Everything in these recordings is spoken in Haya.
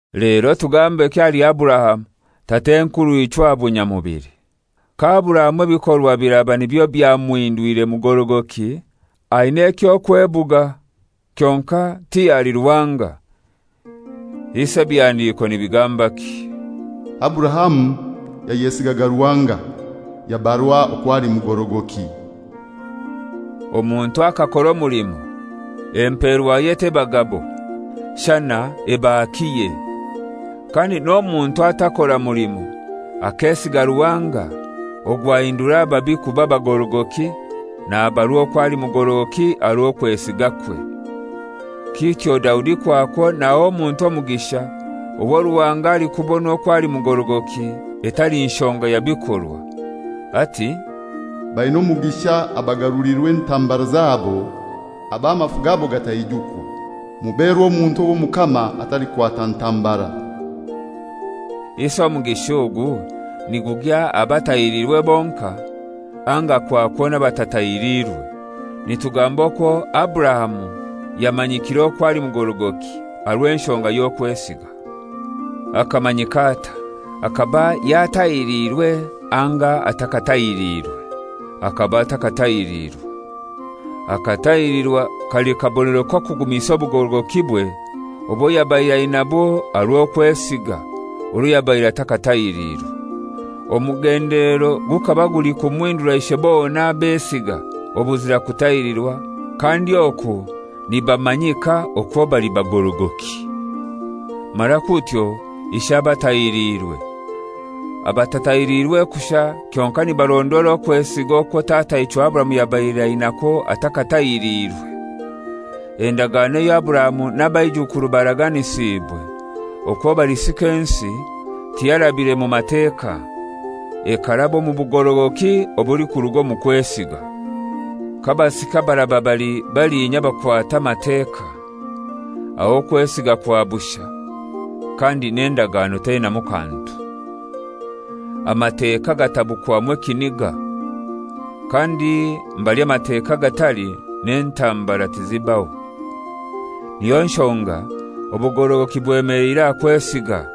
Lero tugambeki ahali Aburahamu, tat'enkurw'ichwe aha bunyamubili! Ka Aburahamu ebikorwa biraba nibyo byamuhindwire mugorogoki, aina eky'okwebuga, kyonkai ti ahali Ruhanga. Isi ebihandiko nibigambaki? «Aburahamu yayesigaga Ruhanga, yabarwa okwo ali mugorogoki.» Omuntu akakora omulimo empeerwaye teba gabo, shana eba hakiye. Kandi n'omuntu atakora mulimo akesiga Ruhanga ogwo ahindura ababi kuba bagorogoki nabarwa okwo ali mugorogoki aha rw'okwesigakwe. Kityo Daudi kwakwo naha omuntu omugisha owo Ruhanga alikubona okwo ali mugorogoki etali nshonga ya bikorwa, ati, «Baina omugisha abagarulirwa entambara zabo, ab'amafu gabo gataijukwa; muberwa omuntu ow'Omukama atalikwata ntambara.» Isi omugisha ogu nigugya aha batahiriirwe bonkai, anga kwakwo n'abatatahirirwe? Nitugamba okwo Aburahamu yamanyikiire okwo ali mugorogoki aha rw'enshonga y'okwesiga. Akamanyika atai? Akaba yatahiriirwe anga atakatahiriirwe? Akaba atakatahiriirwe. Akatahilirwa kali kabonero k'okugumisa obugorogokibwe obwo yabaire ainabwo aha rw'okwesiga orwo yabaire atakatahiriirwe. Omugendelero gukaba guli kumuhindura ishe bona abesiga obuzira kutahirirwa kandi oku nibamanyika okwo bali bagorogoki, mara kutyo ishe abatahiliirwe, abatatahirirwe kushai kyonkai nibarondoora okwesiga okwo tataichwe Aburahamu yabaire ainakwo atakatahiriirwe. Endagano eyo Aburahamu n'abaijukuru baraganisiibwe, okwo balisika ensi, tiyarabire mu Mateka, ekaraba omu bugorogoki obulikuruga omu kwesiga. K'abasika baraba bali balinya abakwata Amateka, aho okwesiga kwa bushai, kandi n'endagano teinamu kantu. Amateka gatabukwamu ekiniga; kandi mbali Amateka gatali n'entambara tizibaho. Niyo nshonga obugorogoki bwemeleire aha kwesiga,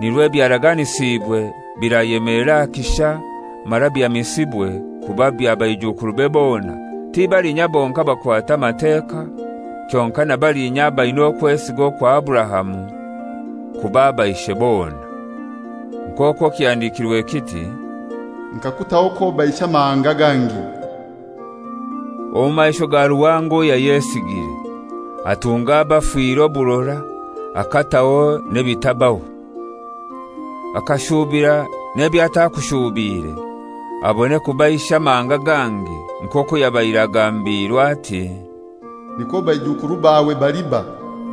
nirwo ebyaraganisiibwe birayemelera aha kisha mara bihamisibwe kuba bya baijukurube bona, ti balinya bonkai abakwata Amateka, kyonkai na balinya abaina okwesiga okwa Aburahamu, kuba aba ishe bona. Nk'okwo kihandikirwe kiti, «Nkakutaho k'oba ishe amahanga gangi» omu maisho ga Ruhanga owo yayesigire, atunga abafire oburora, akataho n'ebitabaho. Akashubira n'eby'atakushuubiire, abone kuba ishe amahanga gangi; nk'okwo yabaire agambiirwe ati, «Nikwo baijukuru bawe baliba.»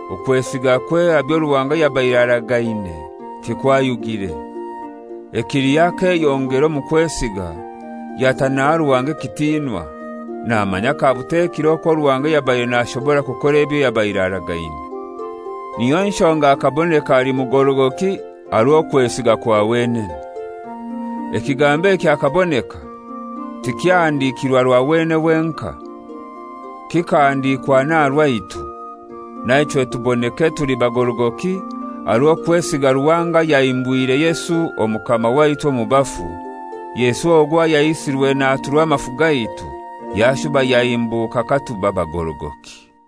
okwesigakwe aha byo Ruhanga yabaire aragaine tigwayugire. Ekiliho akeyongera omu kwesiga, yata naha Ruhanga ekitinwa, namanya kabutekire okwo Ruhanga yabaire nashobora kukora ebyo yabaire aragaine. Niyo nshonga akaboneka ali mugorogoki aha rw'okwesiga kwa wenene. Ekigambo eki «Akaboneka» tikyahandikirwe aha rwa wenene wenkai, kikahandikwa n'aha rwaitu. Naichwe tuboneke tuli bagorogoki aha rw'okwesiga Ruhanga ayahimbwire Yesu Omukama waitu mu bafu, Yesu ogwo ayaisirwe naturwa amafu gaitu, yashuba yahimbuka katuba bagorogoki.